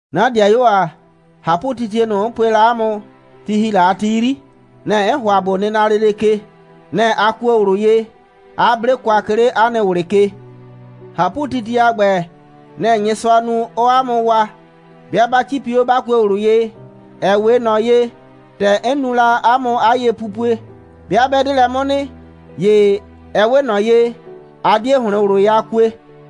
'Na 'dɩayuo ‑a, ꞊hapʋtitie ꞊nʋ, 'n pue la 'a mʋ, ti ‑hi la a ti 'yri, nɛ‑ 'n ‑hʋa ꞊bo nɩna lele ke. Nɛ‑ a kuo ꞊wlʋ ye, 'a 'ble kwa, 'ke 'le 'a nɩ ꞊wlɩ ke. ꞊Hapʋtitie a ‑gbɛ, nɛ‑ Nyɩsʋaa nu, 'ɔɔ 'a mʋ waa, 'bɩa 'ba 'cipi 'o, 'ba kue ꞊wlʋ ye, ‑ɛ 'we ꞊nɔ ye, ‑tɛ 'n nu la 'a mʋ 'a yepupue. 'Bɩa 'bɛ 'de lɛ 'mʋ nɩ, ‑ye ɛ 'we ꞊nɔ ye, a 'die ‑hlɩn ꞊wlʋ ye a kue.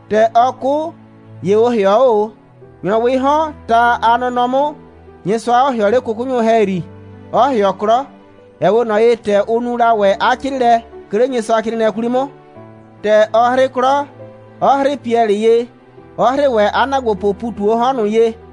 ‑Tɛ ɔ 'kʋ, ‑ye ʋ ‑hɩɔ 'o ꞊o, ‑nyrɔwɩɩ 'hɔn, ta a nɔnɔ 'mʋ, Nyɩsʋa 'ɔ ‑hɩɔ 'le 'kʋkʋnyʋ ‑hɛyri, 'ɔ ‑hɩɔ 'klɔ, ‑ɛ 'we ꞊nɔ ye, ‑tɛ ʋ nu la ‑wɛ 'a 'crɩɩlɛ, 'ke 'le Nyɩsʋacrɩɩnɩɛ 'kwli 'mʋ. ‑Tɛ ɔ 'hrɩ 'klɔ, 'ɔ 'hrɩɩ Piɛlɩ ye, 'ɔ 'hrɩɩ ‑wɛ 'a ‑naagbopʋʋ ‑pu ꞊tu 'o 'hɔn ꞊nʋ ye,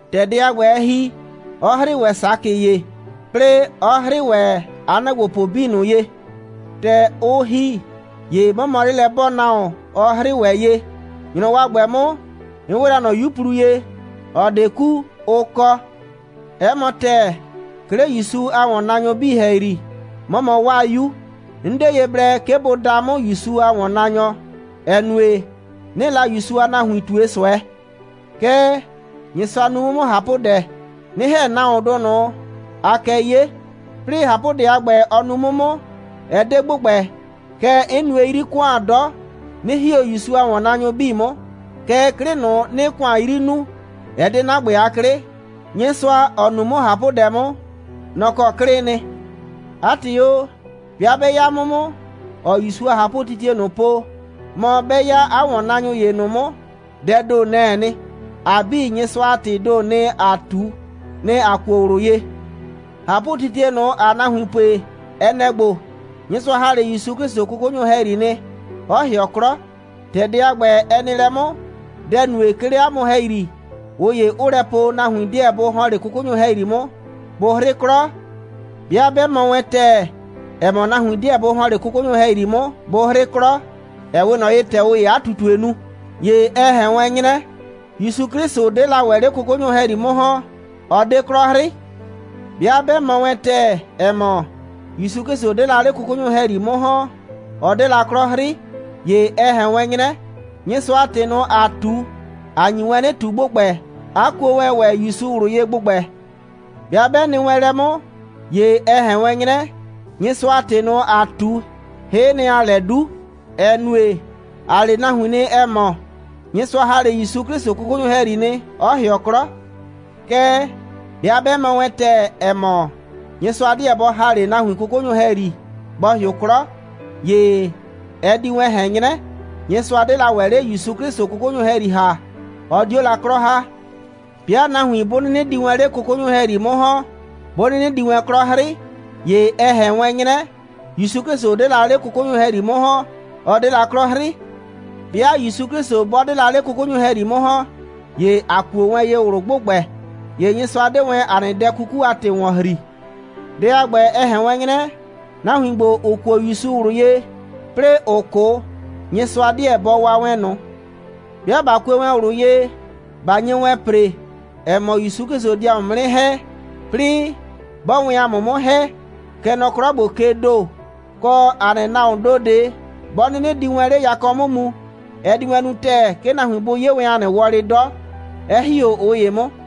‑Tɛ dɛ a ‑gbɛ, ɛ ‑hi, 'ɔ 'hrɩɩ ‑wɛ Sakɩ ye, 'plɩɩ 'ɔ 'hrɩɩ ‑wɛ 'a ‑wɔnnaanyʋ 'bii ꞊nʋ ye. ‑Tɛ ʋ ‑hi, ‑ye 'mɔ mɔ 'lelɛ'bɔɔnahuon, ɔ 'hrɩɩ ‑wɛ ye. ‑Nyrɔwɔ a ‑gbɛ 'mʋ, 'n 'we la ꞊nɔ 'yuplu ye, ‑ɔ 'de ku, ʋ kɔ. 'Ɛ mɔ ‑tɛɛ, 'ke 'le ‑Yusu a ‑wɔnnaanyʋ 'bii ‑hɛyri, 'mɔ mɔ 'waa 'yu. 'N 'de ye blɛ, 'ke bʋ daa 'mʋ ‑Yusu a ‑wɔnnaanyɔ, ‑ɛ nue, 'nɩɩ la ‑Yusu a nahuin ꞊tue ꞊sʋɛ. Kɛɛ, Nyɩsʋa nu 'mʋ 'mʋ ꞊hapʋdɛ, 'nɩ ‑hɛ nahuondʋ ꞊nʋ, aa kɛ 'ye. 'Plɩɩ ꞊hapʋdɛ a ‑gbɛ, ɔ nu 'mʋ 'mʋ, ɛ 'de ‑gbʋgbɛ, kɛɛ, 'n nue 'yri ‑kʋan 'dɔ, 'nɩ ‑hi 'o ‑Yusu a ‑wɔnnaanyʋ 'bii 'mʋ. Kɛɛ, 'klɩ ꞊nʋ, 'nɩɩ ‑kʋan 'yri nuu, ɛ 'de 'na ‑gbɛ a 'klɩ, Nyɩsʋa, ‑ɔ nu 'mʋ ꞊hapʋdɛ 'mʋ, nɔ‑ kɔ 'klɩɩ nɩ. 'A ‑tɩ o, 'bɩa 'bɛ 'ya 'mʋ 'mʋ, ‑ɔɔ ‑Yusu a ꞊hapʋtitie ꞊nʋ po, mɔ 'bɛ 'ya 'a ‑wɔnnaanyʋ ‑ye ꞊nʋ 'mʋ, dɛɛ ‑do, nɛ‑ɛ nɩ. ‑A 'bii, Nyɩsʋa a ‑tɩɩ ‑do, nɩ‑ ‑aa ꞊tu, nɩ‑ a kuo ꞊wlʋ ye. ꞊Hapʋtitie ꞊nʋ, ‑aa nahuin pue, ɛ nɛ‑ ‑gbo: Nyɩsʋa ‑ha 'le ‑Yusu 'Klɩsʋ 'kʋkʋnyʋ ‑hɛyri nɩ, 'ɔ ‑hɩɔ 'klɔ. ‑Tɛ dɛ a ‑gbɛ, ɛ nɩ lɛ 'mʋ, dɛ‑ nue, 'ke 'le 'a mʋ ‑hɛyri, ꞊ʋ ‑ye 'ʋʋ lɛ po, nahuin 'deɛ bʋ ‑hɔn 'le 'kʋkʋnyʋ ‑hɛyri 'mʋ, bʋ 'hrɩ 'klɔ? 'Bɩa 'bɛ mɔ wɛn ‑tɛɛ, ‑ɛ mɔ, nahuin 'deɛ bʋ ‑hɔn 'le 'kʋkʋnyʋ ‑hɛyri 'mʋ, bʋ 'hrɩ 'klɔ, ‑ɛ 'we ꞊nɔ ye, ‑tɛ ꞊ʋ ‑yee 'a ꞊tutue nu, ‑ye ɛ ꞊hɛn wɛn 'nyrɛ, ‑Yusu 'Klɩsʋ 'de la ‑wɛ 'le 'kʋkʋnyʋ ‑hɛyri 'mʋ ‑hɔn, 'ɔ 'de 'klɔ 'hrɩ. 'Bɩa 'bɛ mɔ wɛn ‑tɛɛ, ‑ɛ mɔ, ‑Yusu 'Klɩsʋ 'de la 'le 'kʋkʋnyʋ ‑hɛyri 'mʋ ‑hɔn, ɔ 'de la 'klɔ 'hrɩ, ‑ye ɛ ꞊hɛn wɛn 'nyrɛ, Nyɩsʋa a ‑tɩ ꞊nʋ, ‑aa ꞊tu, ‑a nyi wɛn 'nɩ ꞊tu ‑gbʋgbɛ, 'a kuo wɛn ‑wɛ ‑Yusu ꞊wlʋ ye ‑gbʋgbɛ. 'Bɩa 'bɛ nɩ wɛn lɛ 'mʋ, ‑ye ɛ ꞊hɛn wɛn 'nyrɛ, Nyɩsʋa a ‑tɩ ꞊nʋ, ‑aa ꞊tu, hɩ'ɩ nɩ, ‑aa lɛ 'du, ‑ɛ nue, ‑a le nahuin nɩ, ‑ɛ mɔ, Nyɩsʋa ‑ha 'le ‑Yusu 'Klɩsʋ 'kʋkʋnyʋ ‑hɛyri nɩ, 'ɔ ‑hɩɔ 'klɔ. Kɛɛ, 'bɩa 'bɛ mɔ wɛn ‑tɛɛ, ‑ɛ mɔ, Nyɩsʋa 'deɛ bɔ ‑ha 'le nahuin 'kʋkʋnyʋ ‑hɛyri, bɔ ‑hɩʋ 'klɔ, ‑ye ɛ di wɛn ꞊hɛn 'nyrɛ, Nyɩsʋa 'de la ‑wɛ 'le ‑Yusu 'Klɩsʋ 'kʋkʋnyʋ ‑hɛyri ‑ha, 'ɔ 'dio la 'klɔ ‑ha. 'Bɩa nahuin 'bʋ 'nɩnɩ di wɛn 'le 'kʋkʋnyʋ ‑hɛyri 'mʋ ‑hɔn, 'bʋ 'nɩnɩ di wɛn 'klɔ 'hrɩ, ‑ye ɛ ꞊hɛn wɛn 'nyrɛ, ‑Yusu 'Klɩsʋ 'de la 'le 'kʋkʋnyʋ ‑hɛyri 'mʋ ‑hɔn, 'ɔ 'de la 'klɔ 'hrɩ. 'Bɩa ‑Yusu 'Klɩsʋ 'bɔ 'de la 'le 'kʋkʋnyʋ ‑hɛyri 'mʋ ‑hɔn, ‑ye a kuo wɛn ye ꞊wlʋ ‑gbʋgbɛ, ‑ye Nyɩsʋa 'de wɛn 'a nɩ dɛ 'kuku a ‑tɩ ‑wɔn ‑hri. Dɛ a ‑gbɛ, ɛ ꞊hɛn wɛn 'nyrɛ, nahuin ‑gbo, ‑ʋ kuo ‑Yusu ꞊wlʋ ye, 'plɩɩ ‑ʋ 'kʋ, Nyɩsʋa 'deɛ bʋ waa wɛn ꞊nʋ. 'Bɩa ꞊ba kue wɛn ꞊wlʋ ye, ꞊ba nye wɛn ‑pre, ‑ɛ mɔ, ‑Yusu 'Klɩsʋ di ‑a mʋ 'mʋ 'nɩ ‑hɛ, 'plɩɩ 'bɔɔ wɛn ‑a mʋ 'mʋ ‑hɛ, kɛ nɔ 'klɔ ‑gbo kee ‑do, kɔ, ‑a nɩ nahuoon ‑do ꞊de 'bɔ 'nɩnɩ di wɛn 'le yakɔ 'mʋ mu, ɛ di wɛn nu ‑tɛɛ, 'ke nahuin bʋ 'ye wɛn ‑a nɩ wɔlɩ 'dɔ, 'ɛ ‑hi 'o ꞊ʋ ‑ye 'mʋ.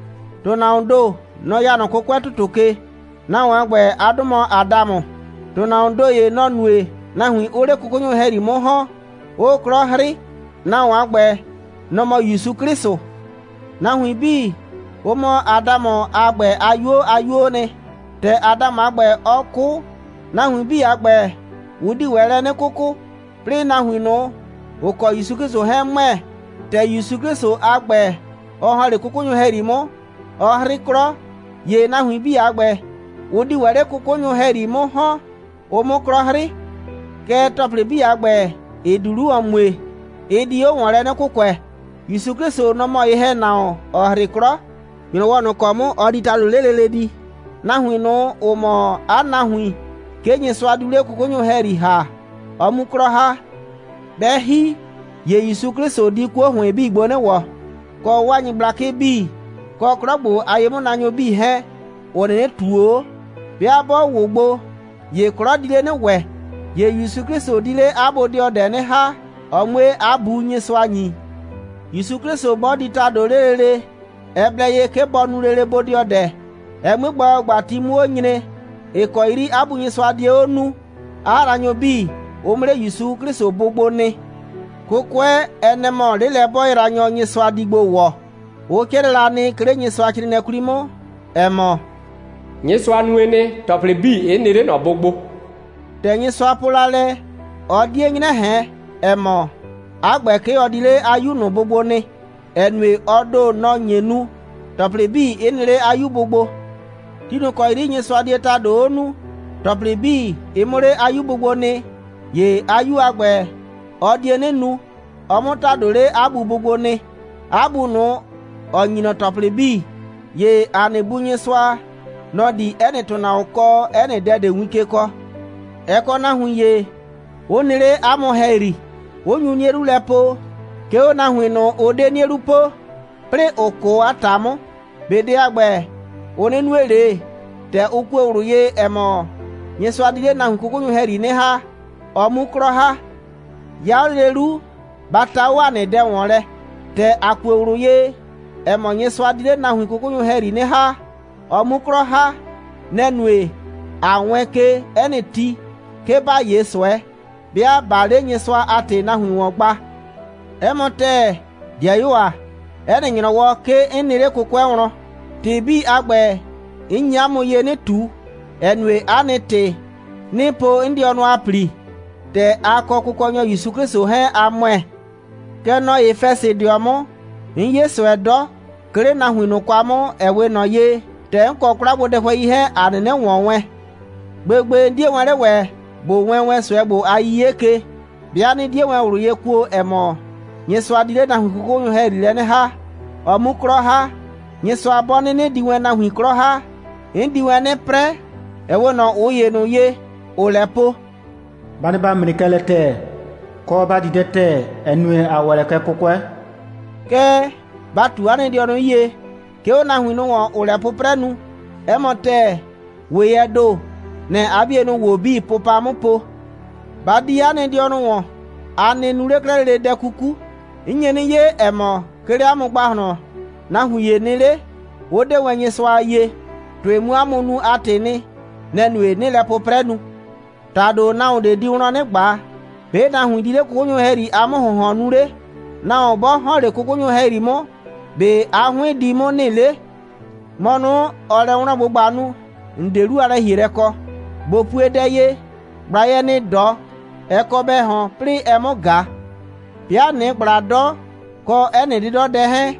‑Tʋnahuoon ‑do, nɔ‑ ya nɔ 'kʋkʋɛ ‑tʋtʋ ke. Nahuon a ‑gbɛ, 'a 'dʋ mɔ Adamʋ. ‑Tʋnahuoon ‑do ‑ye, nɔ‑ nue, nahuin 'ʋʋ 'le 'kʋkʋnyʋ ‑hɛyri 'mʋ ‑hɔn, 'ʋʋ 'klɔ 'hrɩ. Nahuon a ‑gbɛ, nɔ‑ mɔ ‑Yusu 'Klɩsʋ. Nahuin 'bii, ʋ mɔ Adamʋ a ‑gbɛ a 'yuo a 'yuoo nɩ. ‑Tɛ Adamʋ a ‑gbɛ, ɔ 'kʋ, nahuin 'bii a ‑gbɛ, ʋ di ‑wɛ lɛ 'nɩ 'kʋkʋ. 'Plɩɩ, nahuin ꞊nʋ, ‑ʋ kɔ ‑Yusu 'Klɩsʋ 'hɛɛn ‑mʋɛ, ‑tɛ ‑Yusu 'Klɩsʋ a ‑gbɛ, ɔ ‑hɔn 'le 'kʋkʋnyʋ ‑hɛyri 'mʋ, ɔ 'hrɩ 'klɔ, ‑ye nahuin 'bii a ‑gbɛ, ʋ di ‑wɛ 'le 'kʋkʋnyʋ ‑hɛyri 'mʋ ‑hɔn, ʋ 'mʋ 'klɔ 'hrɩ. Kɛɛ, ‑tɔplɩ 'bii a ‑gbɛ, ‑ɩ di 'lu ‑wɔn mue, ɩ di 'o ‑wɔn lɛ 'nɩ kʋkʋɛ. ‑Yusu 'Klɩsʋ, nɔ‑ mɔ ye‑hɛnahuon, ‑ɔ 'hrɩ 'klɔ. ‑Nyrɔwɔ ꞊nʋ ‑kɔ 'mʋ, ɔ di ‑tado 'le lele di, nahuin ꞊nʋ, ‑ʋ mɔ 'a nahuin, 'ke Nyɩsʋa diu 'le 'kʋkʋnyʋ ‑hɛyri ‑ha, ɔ 'mu 'klɔ ‑ha. 'Bɛ ‑hi, ‑ye ‑Yusu 'Klɩsʋ di 'kuo ‑hʋɩn 'bii gbo 'nɩ ‑wɔ, kɔ 'waa nyɩgblakɩ 'bii, kɔ 'klɔ ‑gbo a ye'mʋnaanyʋ 'bii 'hɛɛn, ‑ʋ 'nɩnɩ ꞊tuo 'o. 'Bɩa 'bɔ ‑wʋ gbo, ‑ye 'klɔ di 'le 'nɩ ‑wɛ. ‑Ye ‑Yusu 'Klɩsʋ di 'le 'a bodɩɔdɛ 'nɩ ‑ha, ɔ 'mue 'a Bu Nyɩsʋa ‑nyi. ‑Yusu 'Klɩsʋ 'bɔ di ‑tado 'le lele, ɛ blɛ ye, 'ke bɔ nu lele bodɩɔdɛ, ɛ 'mue gba ‑gbagba, ti 'mʋ 'o nyre, ‑ɩ kɔ 'yri 'a Bu Nyɩsʋa die 'o nuu, 'a yraanyʋ 'bii, ʋ 'mʋ 'le ‑Yusu 'Klɩsʋ bʋ gbo nɩ. 'Kʋkʋɛ, ɛ nɛ‑ mɔ 'lelɛ'bɔɔyraanyɔ, Nyɩsʋa di gbo ‑wɔ. Ʋ 'crɩɛ la nɩ, 'ke 'le Nyɩsʋacrɩɩnɩɛ 'kwli 'mʋ, ‑ɛ mɔ: «Nyɩsʋa nue nɩ, ‑tɔplɩ 'bii 'ɩ nɩ 'le ꞊nɔ bʋ gbo.» ‑Tɛ Nyɩsʋa po la lɛ, ɔ 'die 'nyrɛ ꞊hɛn, ‑ɛ mɔ, 'a ‑gbɛ, 'ke ɔ di 'le 'a 'Yu ꞊nʋ bʋ gbo nɩ, ‑ɛ nue, ɔ ‑do, nɔ‑ nye nu, ‑tɔplɩ 'bii 'ɩ nɩ 'le 'a 'Yu bʋ gbo. Ti ꞊nʋ ‑kɔ 'yri Nyɩsʋa die ‑tado 'o nuu, ‑tɔplɩ 'bii, ɩ 'mʋ 'le 'a 'Yu bʋ gbo nɩ, ‑ye 'a 'Yu a ‑gbɛ, ɔ die 'nɩ nu, ɔ 'mʋ ‑tado 'le 'a Bu bʋ gbo nɩ, 'a Bu ꞊nʋ, ‑ɔ ‑nyi ꞊nɔ ‑tɔplɩ 'bii. ‑Ye ‑a nɩ Bu Nyɩsʋa, nɔ‑ di 'ɛ nɩ ‑tʋnahuon kɔ 'ɛ nɩ dɛ ꞊de win ke kɔɔ. Ɛ kɔ nahuin ‑ye, 'ʋ nɩ 'le 'a mʋ ‑hɛyri, 'ʋ nyu 'nie 'lu lɛ po, 'ke 'o nahuin ꞊nʋ, ‑ʋ 'de 'nie 'lu po, 'plɩɩ ‑ʋ 'kʋ a ‑ta 'mʋ. ꞊Be dɛ a ‑gbɛ, ʋ 'nɩ nue ꞊le, ‑tɛ ʋ kue ꞊wlʋ ye, ‑ɛ mɔ, Nyɩsʋa di 'le nahuin 'kʋkʋnyʋ ‑hɛyri 'nɩ ‑ha, ɔ 'mu 'klɔ ‑ha? 'Ya 'o lele 'lu, ba ta 'o ‑a nɩ dɛ ‑wɔn lɛ. ‑Tɛ ‑a kue ꞊wlʋ ye, ‑ɛ mɔ, Nyɩsʋa di 'le nahuin 'kʋkʋnyʋ ‑hɛyri 'nɩ ‑ha, ɔ 'mu 'klɔ ‑ha, nɛ‑ nue, ꞊a wɛɛn ke 'ɛ nɩ ti, 'ke ‑ba 'ye ꞊sʋɛ, 'bɩa ꞊baa 'le Nyɩsʋa a ‑tɩ nahuin ‑wɔn gba. 'Ɛ mɔ ‑tɛɛ, 'dɩayuo ‑a, 'ɛ nɩ ‑nyrɔwɔ, 'ke 'n nɩ 'le 'kʋkʋɛ wlɔn. ‑Tɩ 'bii a ‑gbɛ, 'n nyi 'a mʋ ye 'nɩ ꞊tu, ‑ɛ nue, 'a nɩ ‑tɩ, 'nɩɩ po 'n dɩɔnʋ a ‑pli, ‑tɛ a kɔ Kʋkɔnyɔ ‑Yusu 'Klɩsʋ 'hɛɛn, a ‑mʋɛ. Kɛ nɔ Efɛsɩdɩɔ 'mʋ, 'n 'ye ꞊sʋɛ 'dɔ, 'ke 'le nahuin ꞊nʋ kwa 'mʋ, ‑ɛ 'we ꞊nɔ ye, ‑tɛ 'n kɔ 'kwlagbodɛhʋɛi 'hɛɛn, ‑a 'nɩnɩ ‑wɔn wɛn. Gbegbe, 'n 'die wɛn 'le ‑wɛ ꞊bo wɛɛn ꞊sʋɛ ‑gbo a 'yiye ke, 'bɩa 'nɩ 'die wɛn ꞊wlʋ ye kuo, ‑ɛ mɔ, Nyɩsʋa di 'le nahuin 'kʋkʋnyʋ ‑hɛyri 'nɩ ‑ha, ɔ 'mu 'klɔ ‑ha. Nyɩsʋa 'bɔ 'nɩnɩ di wɛn nahuin 'klɔ ‑ha, 'n di wɛn 'nɩ 'prɛ, ‑ɛ 'we ꞊nɔ ꞊ʋ ‑ye ꞊nʋ ye, ‑ʋʋ lɛ po: «Ba nɩ ‑ba 'mre kɛ lɛ ‑tɛɛ, kɔ, ‑ba di dɛ ‑tɛɛ, ‑ɛ nue, ‑a ‑wɛ lɛ kɛ 'kʋkʋɛ.» Kɛɛ, ba ꞊tu 'a nɩ dɩɔnʋ 'yie, 'ke 'o nahuin ꞊nʋ ‑wɔn, ‑ʋʋ lɛ 'pʋprɛ nu. 'Ɛ mɔ ‑tɛɛ: ‑Weyɛɛ ‑do, nɛ‑ɛ 'a 'bienʋ ‑wo 'bii pʋpa 'mʋ po. Ba di 'a nɩ dɩɔnʋ ‑wɔn! A nɩ nu 'le 'klɛɛ lele dɛ 'kuku. 'N nye 'nɩ 'ye, ‑ɛ mɔ, 'ke 'le 'a mʋ ‑gbahlɔn, nahuin ‑ye nɩ 'le, 'ʋ 'de wɛn Nyɩsʋa a yie. ‑Tʋɩ 'mʋ 'a mʋ nu a ‑tɩɩ nɩ, nɛ‑ nue, 'nɩɩ lɛ 'pʋprɛ nu. ‑Tado nahuon ꞊de di wlɔn 'nɩ ꞊gba: ‑Be' nahuin di 'le 'kʋkʋnyʋ a ‑hɛyri a 'mʋ‑hʋnhɔn nu 'le? Nahuon 'bɔ ‑hɔn 'le 'kʋkʋnyʋ ‑hɛyri 'mʋ, ‑be' 'a 'hʋɩn di 'mʋ nɩ 'le? ‑Mɔ ꞊nʋ, ‑ɔɔ lɛ wlɔn꞊gbʋgba nu, ‑n 'de 'lu a lɛ‑hielɛ kɔ. ꞊Bo pue dɛ ye: ꞊Gblayɛ ‑nɩɩ 'dɔ, ɛ kɔ bɛ ꞊hɔn, 'plɩɩ ɛ 'mʋ ꞊ga. 'Bɩa ꞊nɩɩ ꞊gbla 'dɔ, kɔ 'ɛ nɩ 'dɩdɔdɛ 'hɛɛn,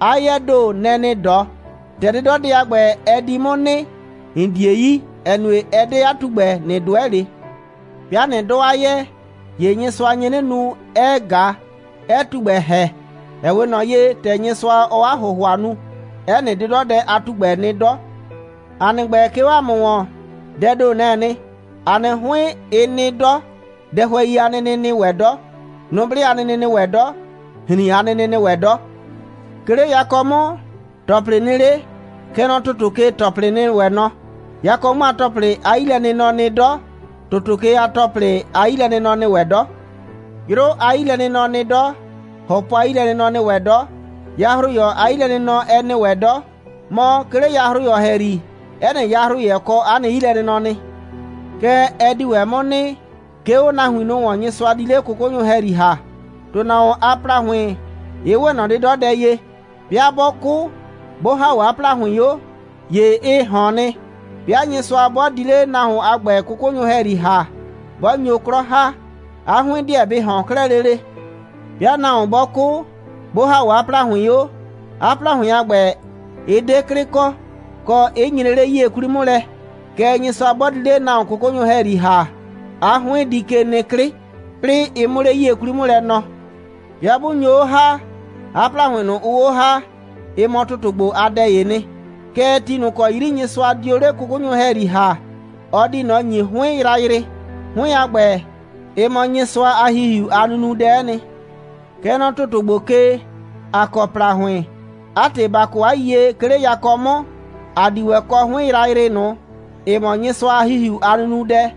'a 'yɛɛ ‑do, nɛ‑ ‑nɩɩ 'dɔ. ‑Tɛ 'dɩdɔdɛ a ‑gbɛ, ɛ di 'mʋ nɩ, ‑n 'die yi, ‑ɛ nue, ɛ 'de 'a tugbɛ, ꞊nɩ 'dʋɛ ꞊le. 'Bɩa ꞊nɩ 'dɔ 'a 'yɛɛ, ‑ye Nyɩsʋa nye 'nɩ nu, 'ɛɛ ꞊ga, 'ɛɛ tugbɛ ‑hɛ, ‑ɛ 'we ꞊nɔ ye, ‑tɛ Nyɩsʋa, ɔɔ 'a ‑hʋhʋa nu. 'Ɛ nɩ 'dɩdɔdɛ a tugbɛ nɩ 'dɔ. ‑A nɩ ‑gbɛ, 'ke 'o ‑a mʋ ‑wɔn, dɛɛ ‑do, nɛ‑ɛ nɩ. ‑A nɩ 'hʋɩn, ɩ nɩ 'dɔ, dɛhʋɛi a nɩnɩ 'ɩ nɩ ‑wɛ 'dɔ, nʋblɩ a nɩnɩ 'ɩ nɩ ‑wɛ 'dɔ, ‑hrin a nɩnɩ 'ɩ nɩ ‑wɛ 'dɔ. 'Ke 'le yakɔ 'mʋ, ‑tɔplɩ nɩ 'le, kɛ nɔ ‑tʋtʋ ke, ‑tɔplɩ 'ɩ nɩ ‑wɛ nɔ. Yakɔ 'mʋ a ‑tɔplɩ a 'yilɛnɩnɔ nɩ 'dɔ, ‑tʋtʋ ke a ‑tɔplɩ a 'yilɛnɩnɔ nɩ ‑wɛ 'dɔ. 'Yrʋ a 'yilɛnɩnɔ nɩ 'dɔ, ‑hɔpɔ a 'yilɛnɩnɔ 'ɛ nɩ ‑wɛ 'dɔ, yahroyɔ a 'yilɛnɩnɔ 'ɛ nɩ ‑wɛ 'dɔ. Mɔ, 'ke 'le yahroyɔ ‑hɛyri, 'ɛ nɩ yahroyɛ kɔ 'a nɩ 'yilɛnɩnɔ nɩ. Kɛ ɛ di ‑wɛ 'mʋ nɩ, 'ke 'o nahuin ꞊nʋ ‑wɔn, Nyɩsʋa di 'le 'kʋkʋnyʋ ‑hɛyri ‑ha. ‑Tʋnahuon a ‑plahʋɩn, ɩ 'we ꞊nɔ 'dɩdɔdɛ ye. 'Bɩa 'bɔ 'kʋ, 'bʋ ‑ha 'o 'a ‑plahʋɩn 'o, ‑ye ɩ ꞊hɔn nɩ. 'Bɩa Nyɩsʋa 'bɔ di 'le nahuon a ‑gbɛ 'kʋkʋnyʋ ‑hɛyri ‑ha, 'bɔ nyo 'klɔ ‑ha, 'a 'hʋɩn 'deɛ bɩ ꞊hɔn 'klɛɛ lele. 'Bɩa nahuon 'bɔ 'kʋ, 'bʋ ‑ha 'o 'a ‑plahʋɩn 'o, 'a ‑plahʋɩn a ‑gbɛ, ɩ 'de 'klɩ kɔ, kɔ, 'ɩ nyree 'le 'yie 'kwli 'mʋ lɛ. Kɛɛ, Nyɩsʋa 'bɔ di 'le nahuon 'kʋkʋnyʋ ‑hɛyri ‑ha, 'a 'hʋɩn di ke nɩ 'klɩ, 'plɩɩ ɩ 'mʋ 'le 'yie 'kwli 'mʋ lɛ nɔɔ. 'Bɩa 'bʋ nyo 'o ‑ha, 'a ‑plahʋɩn ꞊nʋ, ʋʋ 'o ‑ha, ɩ mɔ ‑tʋtʋ ‑gbo a dɛ'ɛ nɩ. Kɛɛ, ti ꞊nʋ ‑kɔ 'yri Nyɩsʋa dio 'le 'kʋkʋnyʋ ‑hɛyri ‑ha, ɔ di ꞊nɔ ‑nyi 'hʋɩn yrayrɩ. 'Hʋɩn a ‑gbɛ, ɩ mɔ Nyɩsʋa a ‑Hihiu a nunudɛ'ɛ nɩ. Kɛ nɔ ‑tʋtʋ ‑gbo ke, ‑a kɔ ‑plahʋɩn. 'A ‑tɩ, ba kɔ 'a yiyie, 'ke 'le yakɔ 'mʋ, ‑a di ‑wɛ kɔ 'hʋɩn yrayrɩ ꞊nʋ, ‑ɩ mɔ Nyɩsʋa a ‑Hihiu a nunudɛ.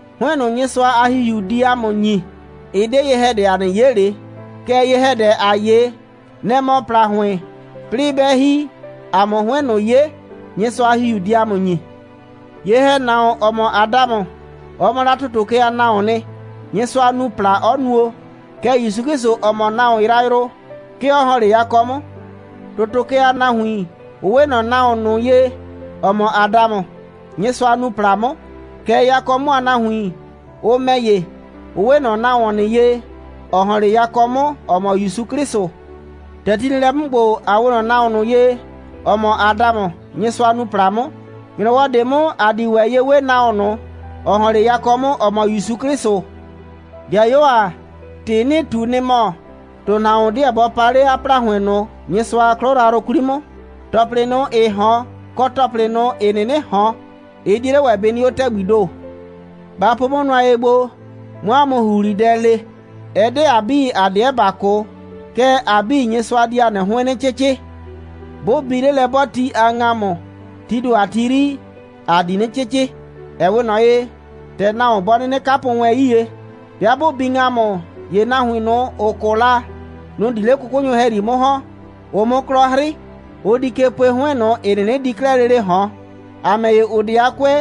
'Hʋɩn ꞊nʋ, Nyɩsʋa a ‑Hihiu di ‑a mʋ ‑nyi, ɛ 'de ye‑hɛdɛ, ‑a 'nɩ 'ye ꞊le. Kɛɛ, ye‑hɛdɛ, ‑aa 'ye, nɛ‑ mɔ ‑plahʋɩn, 'plɩɩ 'bɛ ‑hi, ‑a 'mʋ 'hʋɩn ꞊nʋ 'ye, Nyɩsʋa a ‑Hihiu di ‑a mʋ ‑nyi. Ye‑hɛnahuon, ‑ɔ mɔ Adamʋ, ɔ mɔ la ‑tʋtʋ ke a nahuoon nɩ, Nyɩsʋa nu ‑pla, 'ɔ nuo. Kɛɛ, ‑Yusu 'Klɩsʋ, ‑ɔ mɔ nahuon yrayrʋ, 'ke ɔ ‑hɔn 'le yakɔ 'mʋ. ‑Tʋtʋ ke a nahuin, ʋ 'we ꞊nɔ nahuon ꞊nʋ ye, ‑ɔ mɔ Adamʋ, Nyɩsʋa nuu ‑pla 'mʋ. Kɛɛ, yakɔ 'mʋ a nahuin, ʋ ‑mɛ ‑ye, ʋ 'we ꞊nɔ nahuon ꞊nʋ ye, ‑ɔ ‑hɔn 'le yakɔ 'mʋ, ‑ɔ mɔ ‑Yusu 'Klɩsʋ. ‑Tɛ ti nɩ lɛ 'mʋ ‑gbo, ‑a 'we ꞊nɔ nahuon ꞊nʋ ye, ‑ɔ mɔ Adamʋ, Nyɩsʋa nuu ‑pla 'mʋ. ‑Nyrɔwɔ ꞊de 'mʋ, ‑a di ‑wɛ ye 'we nahuon ꞊nʋ, ‑ɔ ‑hɔn 'le yakɔ 'mʋ, ‑ɔ mɔ ‑Yusu 'Klɩsʋ. 'Dɩayuo ‑a, ‑tɩ 'nɩɩ ꞊tu, nɩ‑ mɔ: ‑Tʋnahuon 'deɛ bɔ paa 'le 'a ‑plahʋɩn ꞊nʋ Nyɩsʋa a 'klɔ yrayrʋ 'kwli 'mʋ. ‑Tɔplɩ ꞊nʋ, ‑ɩɩ ꞊hɔn, kɔ ‑tɔplɩ ꞊nʋ, ‑ɩ 'nɩnɩ ꞊hɔn, ɩ 'die 'le ‑wɛ bɩ nɩ 'o ‑tɛgbii ‑do. Ba po 'mʋ nʋa ye gbo, 'mʋ 'a mʋ ‑huhlidɛ le: Ɛ 'de ‑a 'bii, ‑a 'deɛ ‑ba 'kʋ. Kɛɛ, ‑a 'bii, Nyɩsʋa di ‑a nɩ 'hʋɩn 'nɩ 'cɩcɩ. 'Bʋ bi 'lelɛ'bɔɔti a ‑ŋamʋ, tii ‑do a ti 'yri, ‑a di 'nɩ 'cɩcɩ, ‑ɛ 'we ꞊nɔ ye, ‑tɛ nahuon bɔ 'nɩnɩ 'kapʋ wɛn 'yie. 'Bɩa 'bʋ bi ‑ŋamʋ, ‑ye nahuin ꞊nʋ, ‑ʋ 'kʋ la, nʋ‑ di 'le 'kʋkʋnyʋ ‑hɛyri 'mʋ ‑hɔn, ʋ 'mʋ 'klɔ 'hrɩ. Ʋ di ke pue 'hʋɩn ꞊nʋ, ‑ɩ 'nɩnɩ di 'klɛɛ lele ꞊hɔn. ‑A ‑mɛ ‑ye, ‑ʋ 'de a 'kʋɛ,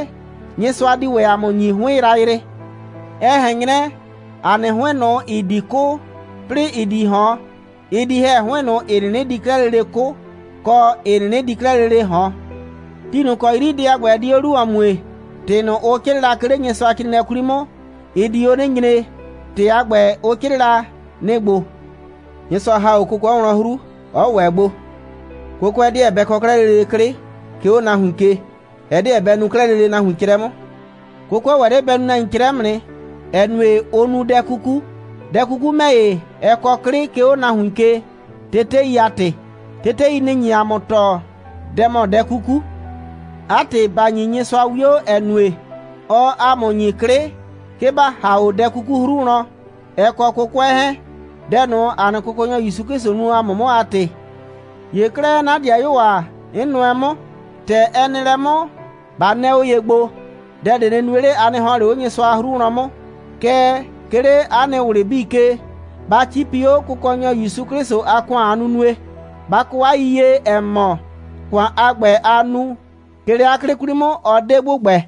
Nyɩsʋa di ‑wɛ ‑a mʋ ‑nyi 'hʋɩn yrayrɩ. Ɛ ꞊hɛn 'nyrɛ, ‑a nɩ 'hʋɩn ꞊nʋ, ‑ɩ di 'kʋ, 'plɩɩ ‑ɩ di ꞊hɔn, ɩ di ‑hɛ 'hʋɩn ꞊nʋ, ‑ɩ 'nɩnɩ di 'klɛɛ lele 'kʋ, kɔ, ‑ɩ 'nɩnɩ di 'klɛɛ lele ꞊hɔn. Ti ꞊nʋ ‑kɔ 'yri dɛ a ‑gbɛ, ɛ di 'o 'lu ‑wɔn mue, ‑tɩ ꞊nʋ, ʋ 'crɩɩ la, 'ke 'le Nyɩsʋacrɩɩnɩɛ 'kwli 'mʋ, ɩ di 'o 'nɩ nyre. ‑Tɩ a ‑gbɛ, ʋ 'crɩɩ la, nɩ‑ ‑gbo: «Nyɩsʋa ‑ha 'o 'kʋkʋɛ wlɔn 'hru. Ɔ ‑wɛ gbo. 'Kʋkʋɛ 'deɛ bɛ kɔ 'klɛɛ lele 'klɩ, 'ke 'o nahuin ke. Ɛ 'deɛ bɛ nu 'klɛɛ lele nahuin 'crɛ 'mʋ.» 'Kʋkʋɛ ‑wɛ 'le bɛ nu nahuin 'crɛ 'mʋ nɩ, ‑ɛ nue, ʋʋ nu dɛ 'kuku. Dɛ 'kuku ‑mɛ ‑ye, ɛ kɔ 'klɩ, 'ke 'o nahuin ke, tetei a ‑tɩ. Tetei, nɩ‑ nye ‑a mɔ tɔɔ, dɛ ‑mɔ dɛ 'kuku. 'A ‑tɩ, ‑ba ‑nyi Nyɩsʋa 'wio, ‑ɛ nue, ɔɔ ‑a mʋ ‑nyi 'klɩ, 'ke ‑ba ‑ha 'o dɛ 'kuku 'hru wlɔn, ɛ kɔ 'kʋkʋɛ 'hɛɛn, dɛ ꞊nʋ, ‑a nɩ Kʋkɔnyɔ ‑Yusu 'Klɩsʋ nu ‑a mʋ 'mʋ a ‑tɩ. ‑Ye 'klɛɛ, 'na ‑dɩayuo ‑a, 'n nʋɛ 'mʋ, ‑tɛ ɛ nɩ lɛ 'mʋ, ba 'nɛɛ 'o ye gbo, dɛ ꞊de nɩ nue 'le, a nɩ ‑hɔn 'le 'o 'hru wlɔn 'mʋ. Kɛɛ, 'ke 'le 'a nɩ ꞊wlɩ 'bii ke, ba 'cipi 'o Kʋkɔnyɔ ‑Yusu 'Klɩsʋ a ‑kʋan a nunue. Ba kɔ 'a yiyie, ‑ɛ mɔ, ‑kʋan a ‑gbɛ, aa nu, 'ke 'le 'a 'klɩ 'kwli 'mʋ, ɔ 'de ‑gbʋgbɛ.